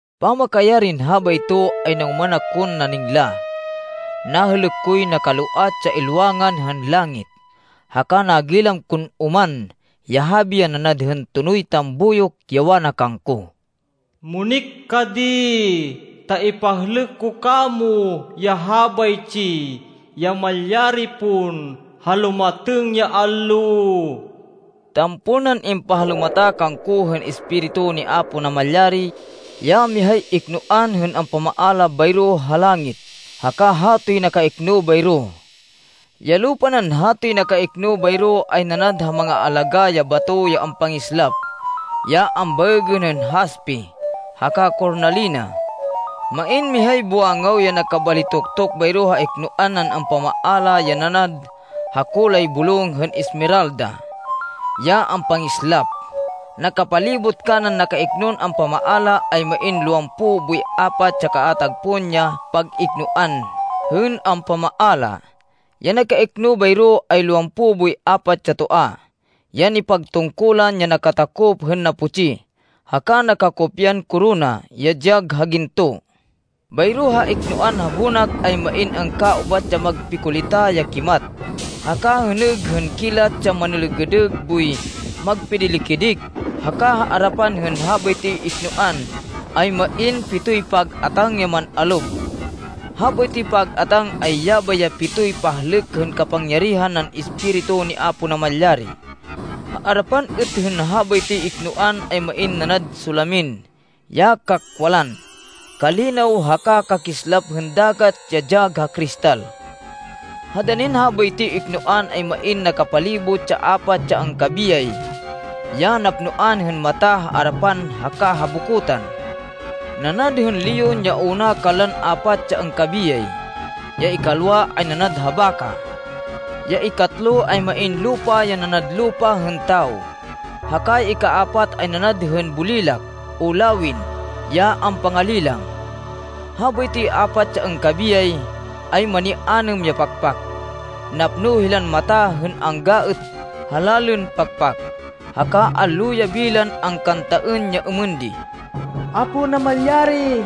Pamakayarin habayto, ay nangoman akon naningla. Nahêlêk koy nakaloat ya ilwangan hên langit! Haka nagilam kon oman, ya habi ya nanad hên tonoy tambuyok, ya wana kangko, “Munik ka di, ta ipahlêk ko kamo ya habaytsi ya malyari pon, ha lumatêng ya allo.” Tampol nan impahalumata kangko hên Espiritu ni Apo Namalyari, ya mihay iknoan hên ampamaala bayro ha langit haka hatoy nakaikno bayro. Ya lupa nan hatoy nakaikno bayro ay nanad ha mangaalagá ya bato ya ampangislap ya ambaêgên hên haspe haka kornalina. Main mihay buwangaw ya nakabalitoktok bayro ha iknoan nan ampamaala ya nanad ha kulay bulong hên esmeralda, ya ampangislap. Nakapalibot kanan nakaiknon ampamaala, ay main lowampo boy apat ya kaatag pon ya pag-iknoan hên ampamaala. Ya nakaikno bayro, ay lowampo boy apat ya toa, ya nipagtungkulan, ya nakatakop hên naputsi haka nakakopyan korona, ya dyag ha ginto. Bayro ha iknoan ha bonak ay main angkaubat ya magpikulita ya kimat haka hênêg hên kilat ya manêlêgêdêg boy magpidili-kidik. Haka ha arapan hên habaytoy iknoan ay main pitoy pag-atáng ya man-alob. Habaytoy pag-atáng, ay yabay ya pitoy pahlêk hên kapangyarihan nan Espiritu ni Apo Namalyari. Ha arapan êt hên habaytoy iknoan ay main nanad solamin ya kakwalan, kalinaw haka kakislap hên dagat ya dyag ha kristal. Ha danin habaytoy iknoan, ay main nakapalibot ya apat ya angkabiyay, ya napnoan hên mata ha arapan haka ha bokotan. Nanad hên leon ya una kanlan apat ya angkabiyay. Ya ikalwa ay nanad ha baka. Ya ikatlo ay main lupa ya nanad lupa hên tawo. Haka ya ikapat ay nanad hên bulilak o lawin ya ampangalilang. Habaytoy apat ya angkabiyay, ay mani-anêm ya pakpak. Napno hilan mata hên angga êt ha lalên pakpak, haka allo yabi lan angkantaên ya êmên di, “Apo Namalyari,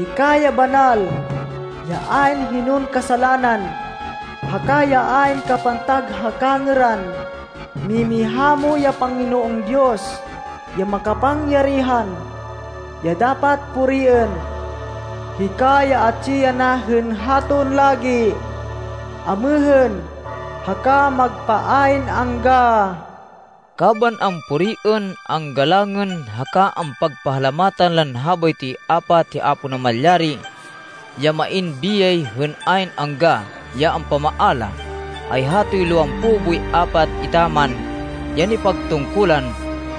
hika ya banal, ya ayn hinon kasalanan, haka ya ayn kapantag ha kangêran, mimiha mo ya Panginoon Diyos ya makapangyarihan, ya dapat puriên. Hika ya atsi yana hên haton lagi, amêhên, haka magpa ayn angga.” Kaban ampuriên, anggalangên haka ampagpahalamatan lan habaytoy apat hi Apo Namalyari, ya main biyay hên ayn angga, ya ampamaala, ay hatoy lowampo boy apat etaman ya nipagtungkulan,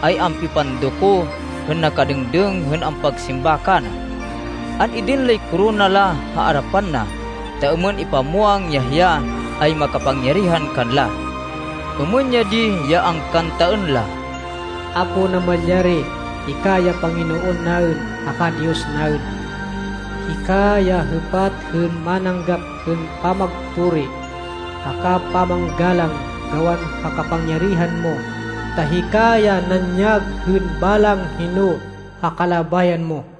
ay ampipandoko hên nakadêngdêng hên ampagsimba kana. An-idin lay korona la ha arapan na ta êmên ipamwang ya hiya ay makapangyarihan kanla. Êmên ya di ya angkantaên la: “Apo Namalyari, hika ya Panginoon naên haka Diyos naên. Hika ya hêpat hên mananggap hên pamagpuri, haka pamanggalang gawan ha kapangyarihan mo, ta hika ya nanyag hên balang hino, ha kalabayan mo.”